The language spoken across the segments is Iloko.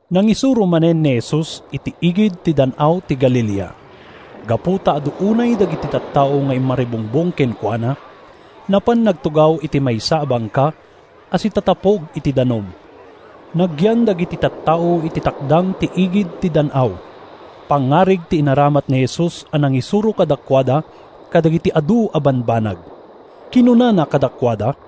Nangisuro manen ni Jesus iti igid ti Dan-aw ti Galilea. Gapu ta adu unay dagiti tattao nga immaribungbong kenkuana, napan nagtugaw iti maysa a bangka a sitatapog iti danum. Nagyan dagiti tattao iti takdang iti igid ti dan-aw. Pangngarig ti inaramat ni Jesus a nangisuro kadakuada kadagiti adu a bambanag. Kinunana kadakuada,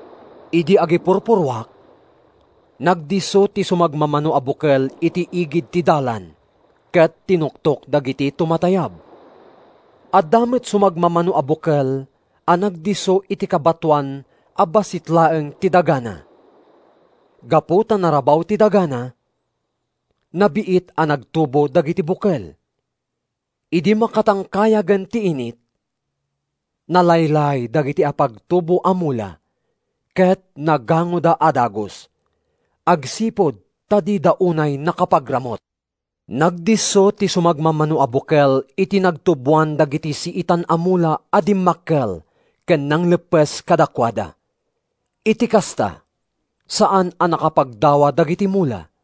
Idi agipurpurruak, nagdisso ti sumagmamano a bukel iti igid ti dalan, ket tinuktok dagiti tumatayab. Adda met sumagmamano a bukel a nagdisso iti kabatoan a bassit laeng ti dagana. Gapu ta narabaw ti dagana, nabiit a nagtubo dagiti bukel. Idi makatangkayagen ti init, nalaylay dagiti apagtubo a mula ket nagangoda a dagus agsipud ta dida unay nakapagramut. Nagdisso ti sumagmamano a bukel iti nagtuboan dagiti siitan a mula a dimmakkel ken nangleppes kadakuada. Iti kasta, saan a nakapagdawa dagiti mula.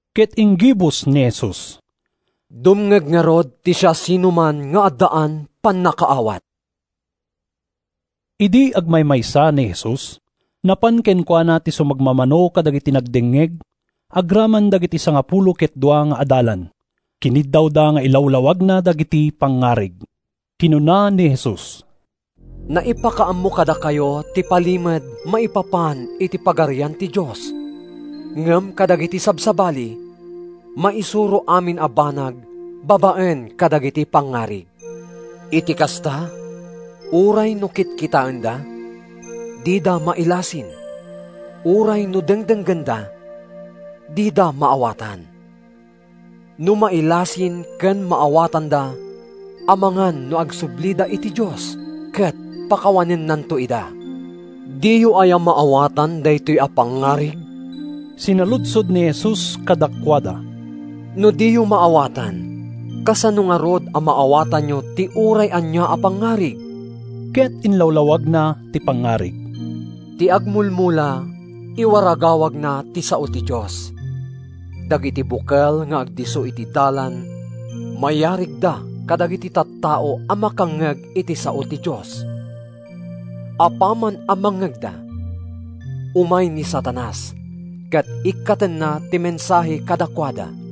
Ket inggibus ni Jesus, “Dumngeg ngarud ti siasinoman nga addaan pannakaawat.” Idi agmaymaysa ni Jesus, napan kenkuana ti sumagmamano kadagiti nagdengngeg agraman dagiti sangapulo ket dua nga adalan. Kiniddawda nga ilawlawagna dagiti pangngarig. Kinuna ni Jesus, “Naipakaammo kadakayo ti palimed maipapan iti Pagarian ti Dios, ngem kadagiti sabsabali, maisuro amin a banag babaen kadagiti pangngarig. Iti kasta, ‘Uray no kitkitaenda, dida mailasin, Uray no dengdenggenda, dida maawatan. No mailasin ken maawatanda Amangan no agsublida iti Dios ket pakawanennanto ida.’” “Diyo aya maawatan daytoy a pangngarig?” sinaludsod ni Jesus kadakuada. “No diyo maawatan, kasano ngarud a maawatanyo ti uray ania a pangngarig?” Ket inlawlawagna ti pangngarig: “Ti agmulmula iwaragawagna ti sao ti Dios. Dagiti bukel nga agdisso iti dalan mayarigda kadagiti tattao a makangngeg iti sao ti Dios; apaman a mangngegda, umay ni Satanas ket ikkatenna ti mensahe kadakuada.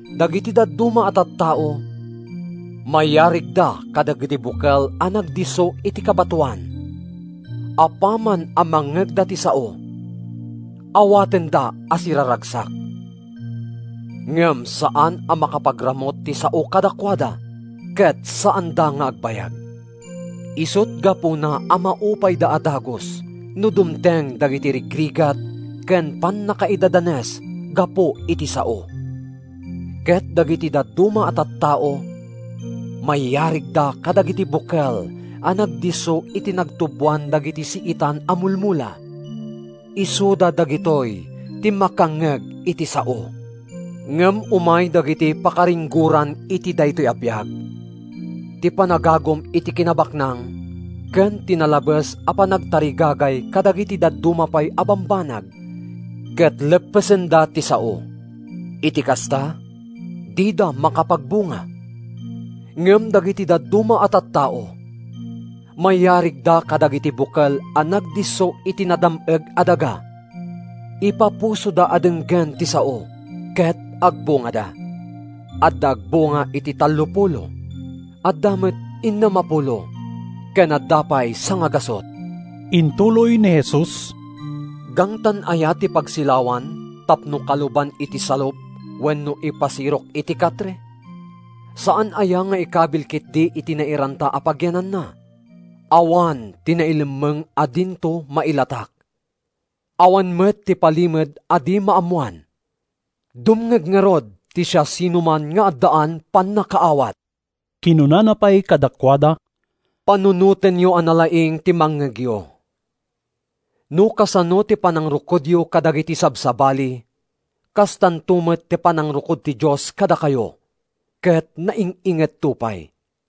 “Dagiti dadduma a tattao mayarigda kadagiti bukel a nagdisso iti kabatoan. Apaman a mangngegda ti sao, awatenda a siraragsak. Ngem saan a makapagramut ti sao kadakuada, ket saanda nga agbayag. Isut’ gapuna a maupayda a dagus no dumteng dagiti rigrigat ken pannakaidadanes gapu iti sao. Ket dagiti dadduma a tattao mayarigda kadagiti bukel a nagdisso iti nagtuboan dagiti siitan a mulmula. Isuda dagitoy ti makangngeg iti sao, ngem umay dagiti pakaringgoran iti daytoy a biag, ti panagagum iti kinabaknang ken ti nalabes a panagtarigagay kadagiti dadduma pay a bambanag, ket leppesenda ti sao. Iti kasta, dida makapagbunga. Ngem dagiti dadduma a tattao, mayarigda kadagiti bukel a nagdisso iti nadam-eg a daga. Ipapusoda a denggen ti sao, ket agbungada: adda agbunga iti tallopulo, adda met innem a pulo ken adda pay sangagasut.” Intuloy ni Jesus, “Gangtan aya ti pagsilawan tapno kaluban iti salup wenno ipasirok iti katre? Saan aya nga ikabil ketdi iti nairanta a pagyananna? Awan ti nailemmeng a dinto mailatak. Awan met ti palimed a di maammoan. Dumngeg ngarud ti siasinoman nga addaan pannakaawat.” Kinunana pay kadakuada: “Panunotenyo a nalaing ti mangngegyo! No kasano ti panangrukodyo kadagiti sabsabali, kastanto met ti panangrukod ti Dios kadakayo; ket naing-ingetto pay!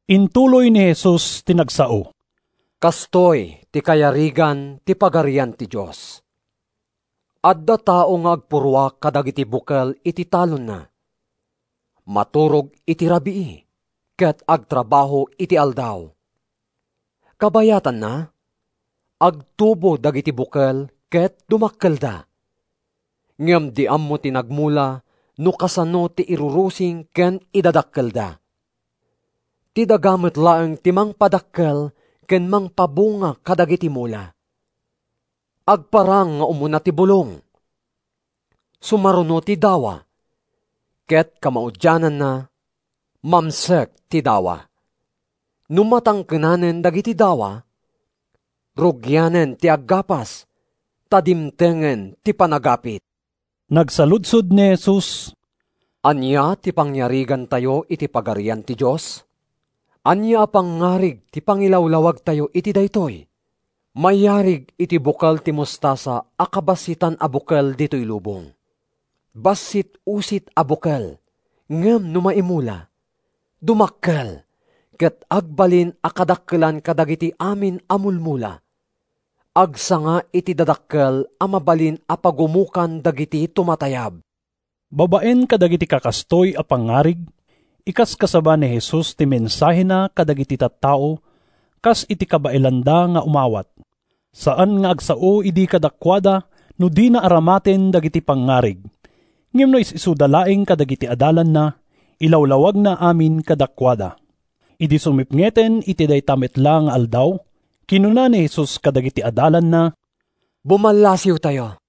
Intuloy ni Jesus ti nagsao, “Kastoy ti kayarigan ti Pagarian ti Dios. Adda tao nga agpurruak kadagiti bukel iti talonna. Maturog iti rabii ket agtrabaho iti aldaw. Kabayatanna, agtubo dagiti bukel ket dumakkelda. Ngem di ammo ti nagmula no kasano ti irurusing ken idadakkelda. Ti daga met laeng ti mangpadakkel ken mangpabunga kadagiti mula: agparang nga umuna ti bulong, sumaruno ti dawa, ket kamaudiananna, mamsek ti dawa. No matangkenanen dagiti dawa, rugianen ti aggapas, ta dimtengen ti panagapit.” Nagsaludsod ni Jesus: “Ania ti pangyarigantayo iti Pagarian ti Dios? Ania a pangngarig ti pangilawlawagtayo iti daytoy? Mayarig iti bukel ti mostasa a kabassitan a bukel ditoy lubong. Bassit-usit a bukel ngem no maimula, dumakkel ket agbalin a kadakkelan kadagiti amin a mulmula. Agsanga iti dadakkel a mabalin a pagumokan dagiti tumatayab.” Babaen kadagiti kakastoy a pangngarig, inkaskasaba ni Jesus ti mensahena kadagiti tattao, kas iti kabaelanda nga umawat. Saan nga agsao idi kadakuada no dina aramaten dagiti pangngarig. Ngem no is-isuda laeng kadagiti adalanna, ilawlawagna amin kadakuada. Idi sumipngeten iti dayta met la nga aldaw, kinuna ni Jesus kadagiti adalanna, “Bumallasiwtayo.”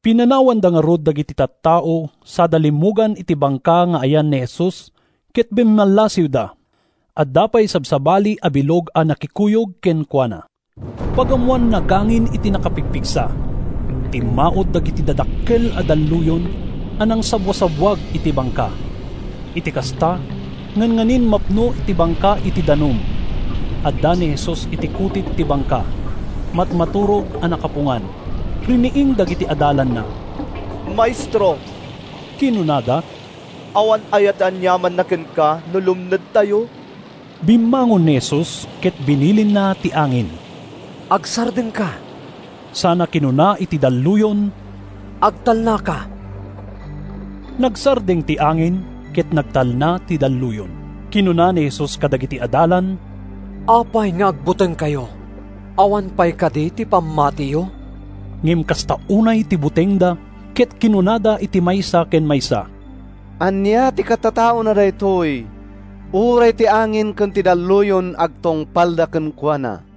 Pinanawanda ngarud dagiti tattao sada limmugan iti bangka nga ayan ni Jesus ket bimmallasiwda. Adda pay sabsabali a bilog a nakikuyog kenkuana. Pagammoan, nagangin iti nakapigpigsa. Timmaud dagiti dadakkel a dalluyon a nangsabbuasabbuag iti bangka. Iti kasta, ngannganin mapno ti bangka iti danum. Adda ni Jesus iti kutit ti bangka. Magmaturog a nakapungan. Riniing dagiti adalanna. “Maestro,” kinunada, “awan aya ti aniamanna kenka no lumnedtayo?” Bimmangon ni Jesus, ket binilinna ti angin, “Agsardengka!” sana kinuna iti dalluyon, “Agtalnaka!” Nagsardeng ti angin, ket nagtalna ti dalluyon. Kinuna ni Jesus kadagiti adalan, “Apay nga agbutengkayo? Awan pay kadi ti pammatiyo?” Ngem kasta unay ti butengda, ket kinunada iti maysa ken maysa, “Ania ti katataona daytoy? Uray ti angin ken ti dalluyon agtungpalda kenkuana!”